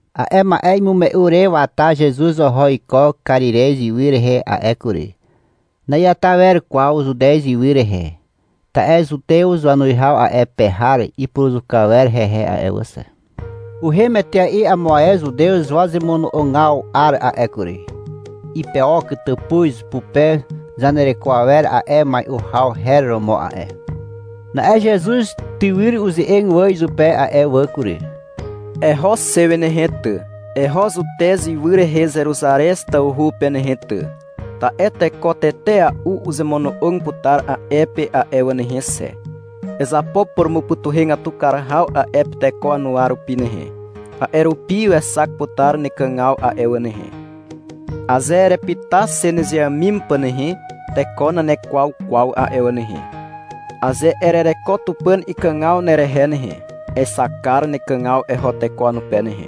A'e ma'e imume'u re wata Zezuz oho iko Karirez ywy rehe a'e kury. Na'iata wer kwaw Zutez ywy rehe, ta'e Zutew wanuwihaw a'e pe har ipuruzuka wer hehe a'e wà xe. Uhem etea'i amo ae Zutew wazemono'ogaw 'ar a'e kury. Ipeok tàpuz pupe zanereko awer a'e mai'u haw her romo a'e. Na'e Zezuz tywyr uze'eg wà izupe a'e wà kury. — Eho xe wi nehe ty, eho Zutez ywy rehe Zeruzarez tawhu pe nehe ty, ta'e teko tetea'u uzemono'og putar a'e pe a'e wà nehe xe. Ezapo purumupytuhegatu kar haw a'e pe teko wanuwa rupi nehe, a'e rupi wexak putar nekàgaw a'e wà nehe. Aze erepyta xe nezeàmim pà nehe, teko nanekwaw kwaw a'e wà nehe. Aze erereko Tupàn ikàgaw nerehe nehe, exak kar nekàgaw eho teko wanupe nehe,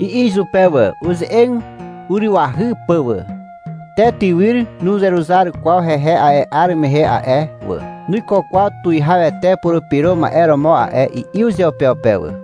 i'i izupe wà, uze'eg urywahy pà wà. Te tywyr nuzeruzar kwaw hehe a'e 'ar rehe a'e wà. — Nuiko kwaw Tuwihawete Purupyro Ma'e romo a'e, i'i uzeupeupe wà.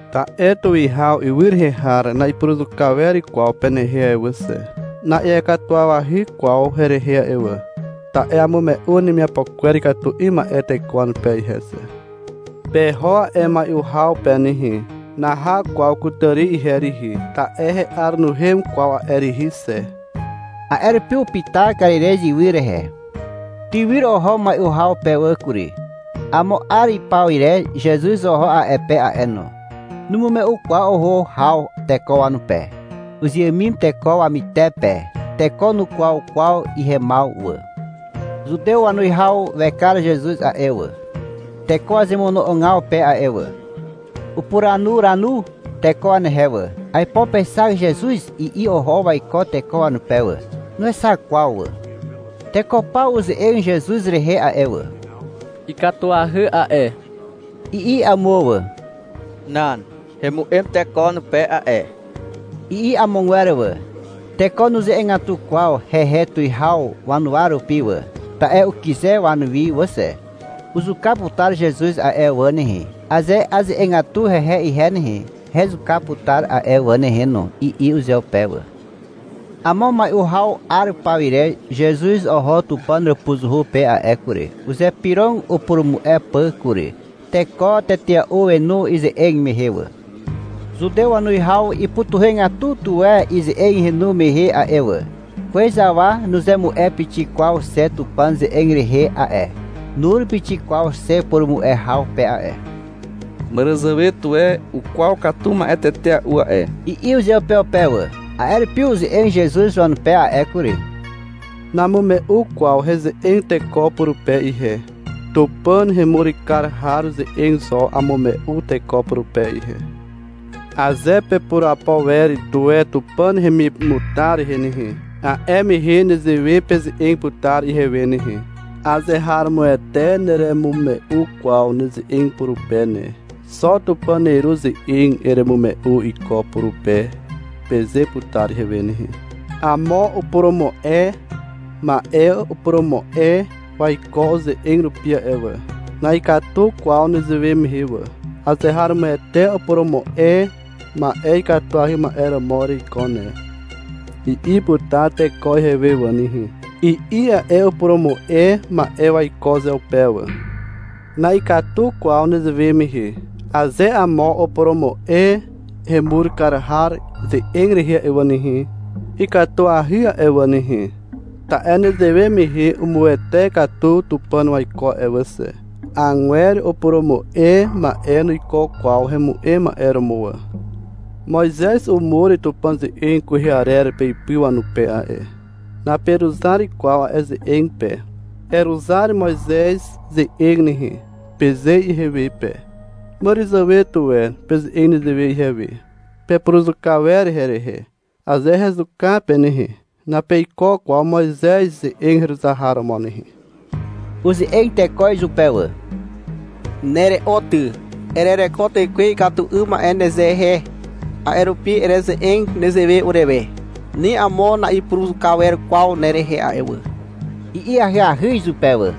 ta'e tuwihaw ywy rehe har na'ipuruzuka wer kwaw penehe a'e wà xe. Na'iakatuwawahy kwaw herehe a'e wà. Ta'e amume'u wanemiapo kwer ikatu 'ym ma'e teko wanupe ihe xe. Peho a'e mai'u haw pe nehe. Naha kwaw kutàri ihe rihi, ta'e he'ar nuhem kwaw a'e rihi xe. A'e rupi upyta Karirez ywy rehe. Tywyr oho mai'u haw pe wà kury. Amo 'ar ipaw ire Zezuz oho a'e pe a'e no. Numume'u kwaw oho haw teko wanupe. Uzeàmim teko wamyter pe. Teko nukwaw kwaw ihemaw wà. Zutew wanuwihaw wekar Zezuz a'e wà, teko wazemono'ogaw pe a'e wà. Upuranuranu teko wanehe wà. — Aipo pexak Zezuz, i'i oho waiko teko wanupe wà. Nuexak kwaw wà. Teko paw uze'eg Zezuz rehe a'e wà. — Ikatuahy a'e, i'i amo wà. — Nan, hemu'em teko wanupe a'e, i'i amogwer wà. Teko nuze'egatu kwaw hehe tuwihaw wanuwa rupi wà, ta'e ukyze wanuwi wà xe. — Uzuka putar Zezuz a'e wà nehe. Aze aze'egatu hehe ihe nehe, hezuka putar a'e wà nehe no, i'i uzeupe wà. Amo mai'u haw 'ar pawire Zezuz oho Tupàn hàpuzuhu pe a'e kury. Uzypyrog upurumu'e pà kury. Teko tetea'u wenu ize'eg mehe wà. Zutew wanuwihaw ipytuhegatu tuwe ize'eg henu mehe a'e wà. — Kwez awa nuzemu'e pixik kwaw xe Tupàn ze'eg rehe a'e, nur pixik kwaw xe purumu'e haw pe a'e. Màràzàwe tuwe ukwaw katu ma'e tetea'u a'e, i'i uzeupeupe wà. A'e rupi uze'eg Zezuz wanupe a'e kury. — Namume'u kwaw heze'eg teko purupe ihe. Tupàn hemur kar har ze'eg zo amume'u teko purupe ihe. Aze pepurapo wer tuwe Tupàn hemimutar rehe nehe, a'e mehe nezewe peze'eg putar ihewe nehe. — Azeharomoete neremume'u kwaw neze'eg purupe ne. Xo Tupàn neru ze'eg eremume'u iko purupe, peze putar ihewe nehe. Amo upurumu'e ma'e upurumu'e waiko uze'eg rupi a'e wà. Na'ikatu kwaw nezewe mehe wà. — Azeharomoete upurumu'e ma'e ikatuahy ma'e romo ereiko ne, i'i putar teko ihewe wà nehe, i'i a'e upurumu'e ma'e waiko uzeupe wà. Na'ikatu kwaw nezewe mehe. Aze amo upurumu'e hemur kar har ze'eg rehe a'e wà nehe, ikatuahy a'e wà nehe, ta'e nezewe mehe umuwete katu Tupàn waiko a'e wà xe. Agwer upurumu'e ma'e nuiko kwaw hemu'em ma'e romo wà. Moizez umur Tupàn ze'eg kwehe arer peipy wanupe a'e. Naperuzar kwaw a'e ze'eg pe. — Eruzar Moizez ze'eg nehe, peze ihewe pe. Màràzàwe tuwe peze'eg nezewe ihewe. Pepuruzuka wer herehe. Aze hezuka pe nehe, napeiko kwaw Moizez ze'eg heruzar har romo nehe. Uze'eg teko izupe wà. — Nere'o ty. Erereko tekwe ikatu 'ym ma'e nezehe, a'e rupi ereze'eg nezewe urewe. Ni amo na'ipuruzuka wer kwaw nerehe a'e wà, i'i ahyahy izupe wà.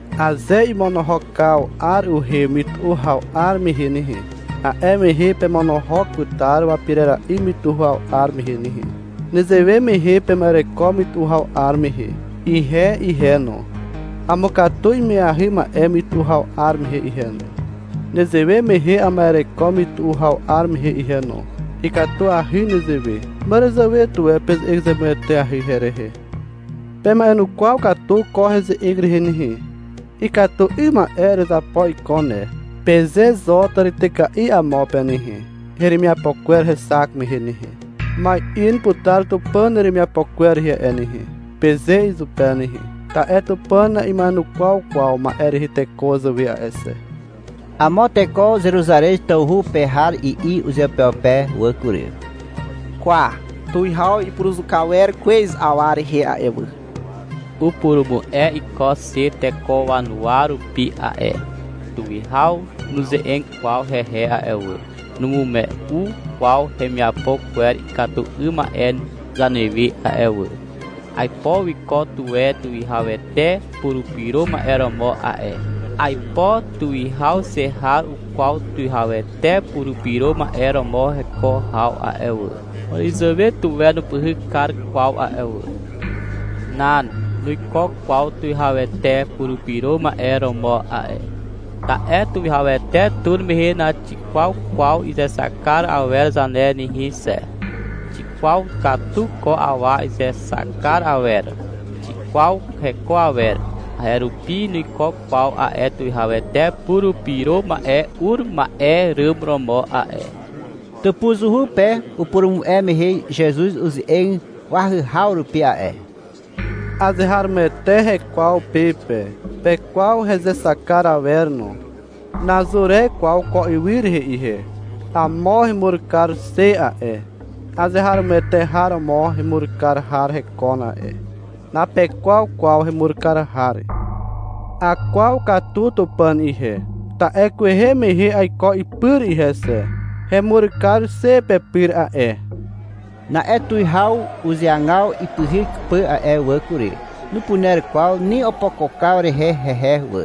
Aze imonohokaw 'ar uhem mytu'u haw 'ar mehe nehe, a'e mehe pemonohok putar wapirera'i mytu'u haw 'ar mehe nehe. Nezewe mehe pema'ereko mytu'u haw 'ar mehe. Ihe ihe no, amukatu ima'eahy ma'e mytu'u haw 'ar mehe ihe no. Nezewe mehe ama'ereko mytu'u haw 'ar mehe ihe no. Ikatuahy nezewe. Màràzàwe tuwe peze'eg zemueteahy herehe. Pema'enukwaw katu ko heze'eg rehe nehe. — Ikatu 'ym ma'e erezapo iko ne, peze zo tàrityka'i amo pe nehe, hemiapo kwer hexak mehe nehe. — Ma'in putar Tupàn neremiapo kwer rehe a'e nehe, peze izupe nehe. Ta'e Tupàn na'ima'enukwaw kwaw ma'e rehe teko wazàwe a'e xe. Amo teko Zeruzarez tawhu pe har i'i uzeupeupe wà kury. — Kwa, tuwihaw ipuruzuka wer kwez awa rehe a'e wà. Upurumu'e iko xe teko wanuwa rupi a'e. Tuwihaw nuze'eg kwaw hehe a'e wà, numume'u kwaw hemiapo kwer ikatu 'ym ma'e zanewe a'e wà. Aipo wiko tuwe Tuwihawete Purupyro Ma'e romo a'e. Aipo tuwihaw xe har ukwaw Tuwihawete Purupyro Ma'e romo heko haw a'e wà. Màràzàwe tuwe nupyhyk kar kwaw a'e wà. Nan, nuiko kwaw Tuwihawete Purupyro Ma'e romo a'e. Ta'e Tuwihawete tur mehe naxikwaw kwaw izexak kar awer zane nehe xe. Xikwaw katu ko awa izexak kar awer. Xikwaw heko awer. A'e rupi nuiko kwaw a'e Tuwihawete Purupyro Ma'e ur ma'e ràm romo a'e. Tàpuzuhu pe upurumu'e mehe Zezuz uze'eg wahyhaw rupi a'e. -Azeharomoete hekwaw pe pe. Pekwaw hezexak kar awer no. Nazur e kwaw ko ywy rehe ihe. Amo hemur kar xe a'e. Azeharomoete har romo hemur kar har hekon a'e. Napekwaw kwaw hemur kar har. Akwaw katu Tupàn ihe, ta'e kwehe mehe aiko ipyr ihe xe. Hemur kar xe pepyr a'e. Na'e tuwihaw uzeagaw ipyhyk pà a'e wà kury. Nupuner kwaw ni opokokaw rehe hehe wà,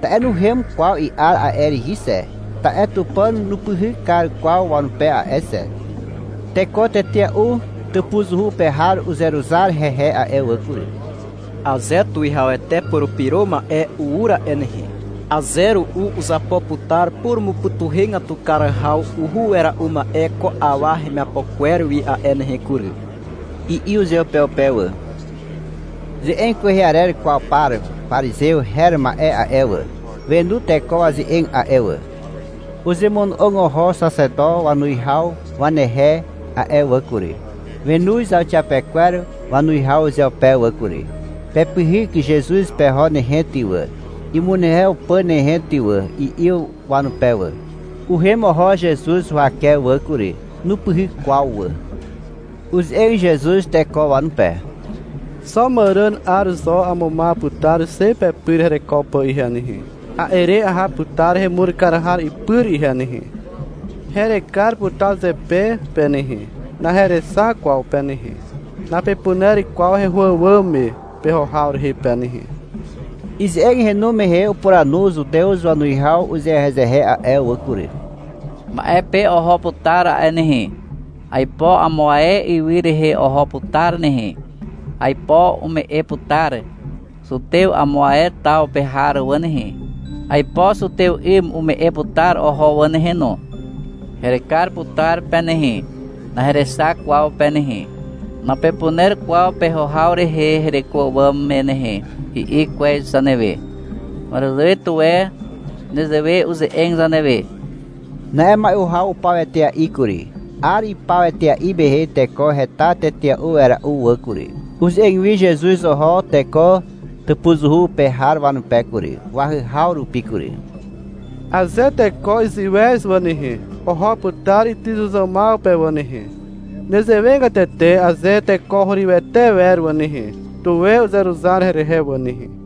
ta'e nuhem kwaw i'ar a'e rihi xe. Ta'e Tupàn nupyhyk kar kwaw wanupe a'e xe. Teko tetea'u tàpuzuhu pe har uzeruzar hehe a'e wà kury. — Aze Tuwihawete Purupyro Ma'e ur a'e nehe, aze ru'u uzapo putar purumupytuhegatu kar haw uhu wera'u ma'e ko awa hemiapo kwer wi a'e nehe kury, i'i uzeupeupe wà. Ze'eg kwehe arer kwaw par parizew her ma'e a'e wà, wenu teko waze'eg a'e wà. Uzemono'og oho xaxeto wanuwihaw wanehe a'e wà kury. Wenoz zauxiapekwer wanuwihaw uzeupe wà kury. — Pepyhyk Zezuz peho nehe ty wà, imunehew pà nehe ty wà, i'i wanupe wà. (Uhem oho Zezuz huwake wà kury. Nupyhyk kwaw wà.) Uze'eg Zezuz teko wanupe. — Xo màràn 'ar zo amumaw putar xe pepyr hereko pà ihe nehe. A'e re aha putar hemur kar har ipyr ihe nehe. Herekar putar zepe pe nehe. Naherexak kwaw pe nehe. Napepuner kwaw heho àwàm me peho haw rehe pe nehe. Ize'eg henu mehe upuranu zutew wanuwihaw uzehezehe a'e wà kury. — Ma'e pe oho putar a'e nehe. Aipo amo ae ywy rehe oho putar nehe. Aipo umu'e putar zutew amo ae taw pe har wà nehe. Aipo zutew 'ym umu'e putar oho wà nehe no. — Herekar putar pe nehe, naherexak kwaw pe nehe. Napepuner kwaw peho haw rehe hereko àwàm me nehe, i'i kwez zanewe. Màràzàwe tuwe nezewe uze'eg zanewe. Na'e mai'u haw upaw etea'i kury. 'Ar ipaw etea'i mehe teko heta tetea'u wera'u wà kury. Uze'eg wi Zezuz oho teko tàpuzuhu pe har wanupe kury, wahyhaw rupi kury. — Aze teko iziwez wà nehe, oho putar ytyzuzàmaw pe wà nehe. Nezewegatete aze teko hurywete wer wà nehe, tuwe uzeruzar herehe wà nehe.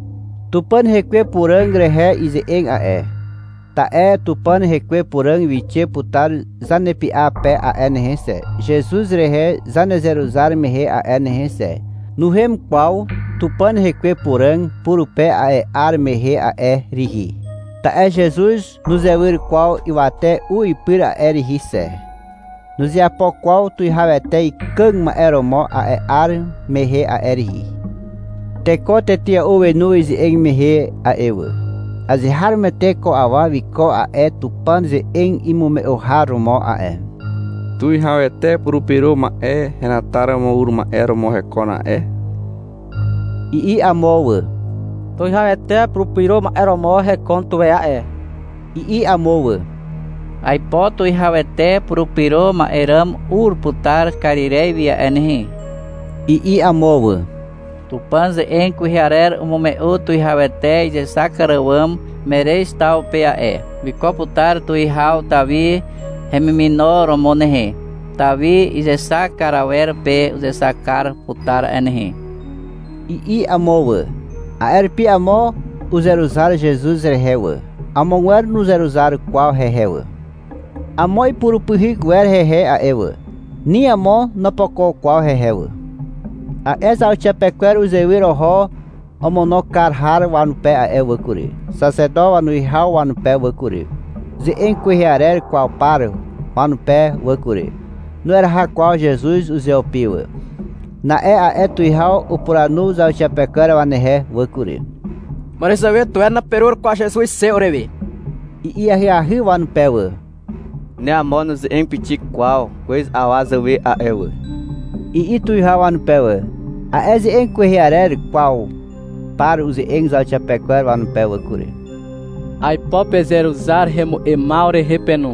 Tupàn rekwe Puràg rehe ize'eg a'e, ta'e Tupàn rekwe Puràg wixe putar zanepy'a pe a'e nehe xe, Zezuz rehe zanezeruzar mehe a'e nehe xe. Nuhem kwaw Tupàn rekwe Puràg purupe a'e 'ar mehe a'e rihi, ta'e Zezuz nuzewyr kwaw ywate u ipyr a'e rihi xe. Nuzeapo kwaw Tuwihawete ikàg ma'e romo a'e 'ar mehe a'e rihi. Teko tetea'u wenu ize'eg mehe a'e wà. — Azeharomoete ko awa wiko a'e Tupàn ze'eg imume'u har romo a'e, Tuwihawete Purupyro Ma'e henataromo ur ma'e romo hekon a'e, i'i amo wà. — Tuwihawete Purupyro Ma'e romo hekon tuwe a'e, i'i amo wà. — Aipo Tuwihawete Purupyro Ma'e ràm ur putar Karirez wi a'e nehe, i'i amo wà. — Tupàn ze'eg kwehe arer umume'u Tuwihawete izexak kar àwàm Merez taw pe a'e. Wiko putar tuwihaw Tawi hemimino romo nehe. Tawi izexak kar awer pe uzexak kar putar a'e nehe, i'i amo wà. A'e rupi amo uzeruzar Zezuz rehe wà, amogwer nuzeruzar kwaw hehe wà. Amo ipurupyhyk wer hehe a'e wà. Ni amo nopokok kwaw hehe wà. A'e zauxiapekwer uzewyr oho omono kar har wanupe a'e wà kury, xaxeto wanuwihaw wanupe wà kury, ze'eg kwehe arer kwaw par wanupe wà kury. Nueraha kwaw Zezuz uzeupi wà. Na'e a'e tuwihaw upuranu zauxiapekwer wanehe wà kury. — Màràzàwe tuwe naperur kwaw Zezuz xe urewe, i'i ahyahy wanupe wà. — Ni amo nuze'eg pixik kwaw kwez awa zàwe a'e wà, i'i tuwihaw wanupe wà. A'e ze'eg kwehe arer kwaw par uze'eg zauxiapekwer wanupe wà kury. — Aipo pezeruzar hemu'emaw rehe pe no,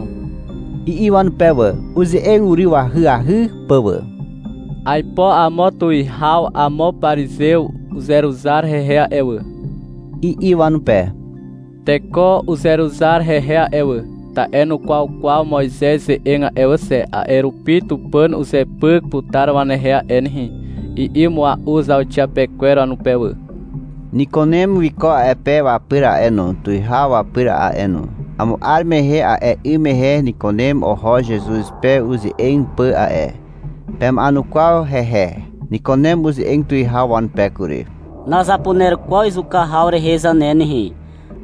i'i wanupe wà, uze'eg uryw ahyahy pà wà. — Aipo amo tuwihaw amo parizew uzeruzar hehe a'e wà, i'i wanupe. Teko uzeruzar hehe a'e wà, ta'e nukwaw kwaw Moizez ze'eg a'e wà xe. A'e rupi Tupàn uzepyk putar wanehe a'e nehe, i'i mua'u zauxiapekwer wanupe wà. Nikunem wiko a'e pe wapyr a'e no, tuwihaw wapyr a'e no. (Amo 'ar mehe a'e 'ym mehe Nikunem oho Zezuz pe uze'eg pà a'e. Pema'enukwaw hehe.) Nikunem uze'eg tuwihaw wanupe kury. — Nazapuner kwaw izuka haw rehe zane nehe,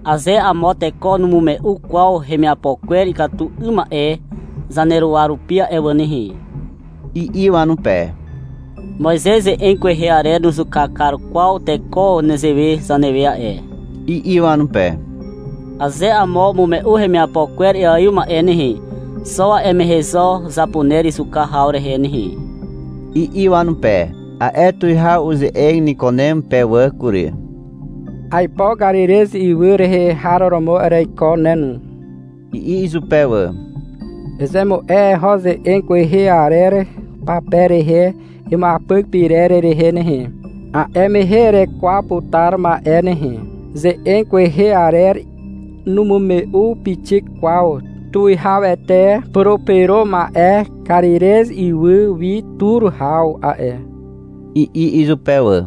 aze amo teko numume'u kwaw hemiapo kwer ikatu 'ym ma'e zaneruwa rupi a'e wà nehe, i'i wanupe. — Moizez ze'eg kwehe arer nuzuka kar kwaw teko nezewe zanewe a'e, i'i wanupe. Aze amo umume'u hemiapo kwer iaiw ma'e nehe, xo a'e mehe zo zapuner izuka haw rehe nehe, i'i wanupe. A'e Tuwihaw uze'eg Nikunem pe wà kury. — Aipo Karirez ywy rehe har romo ereiko ne no, i'i izupe wà. — Ezemu'e eho ze'eg kwehe arer pape rehe imuapyk pyrer rehe nehe. A'e mehe erekwaw putar ma'e nehe. Ze'eg kwehe arer numume'u pixik kwaw Tuwihawete Purupyro Ma'e Karirez ywy wi tur haw a'e, i'i izupe wà.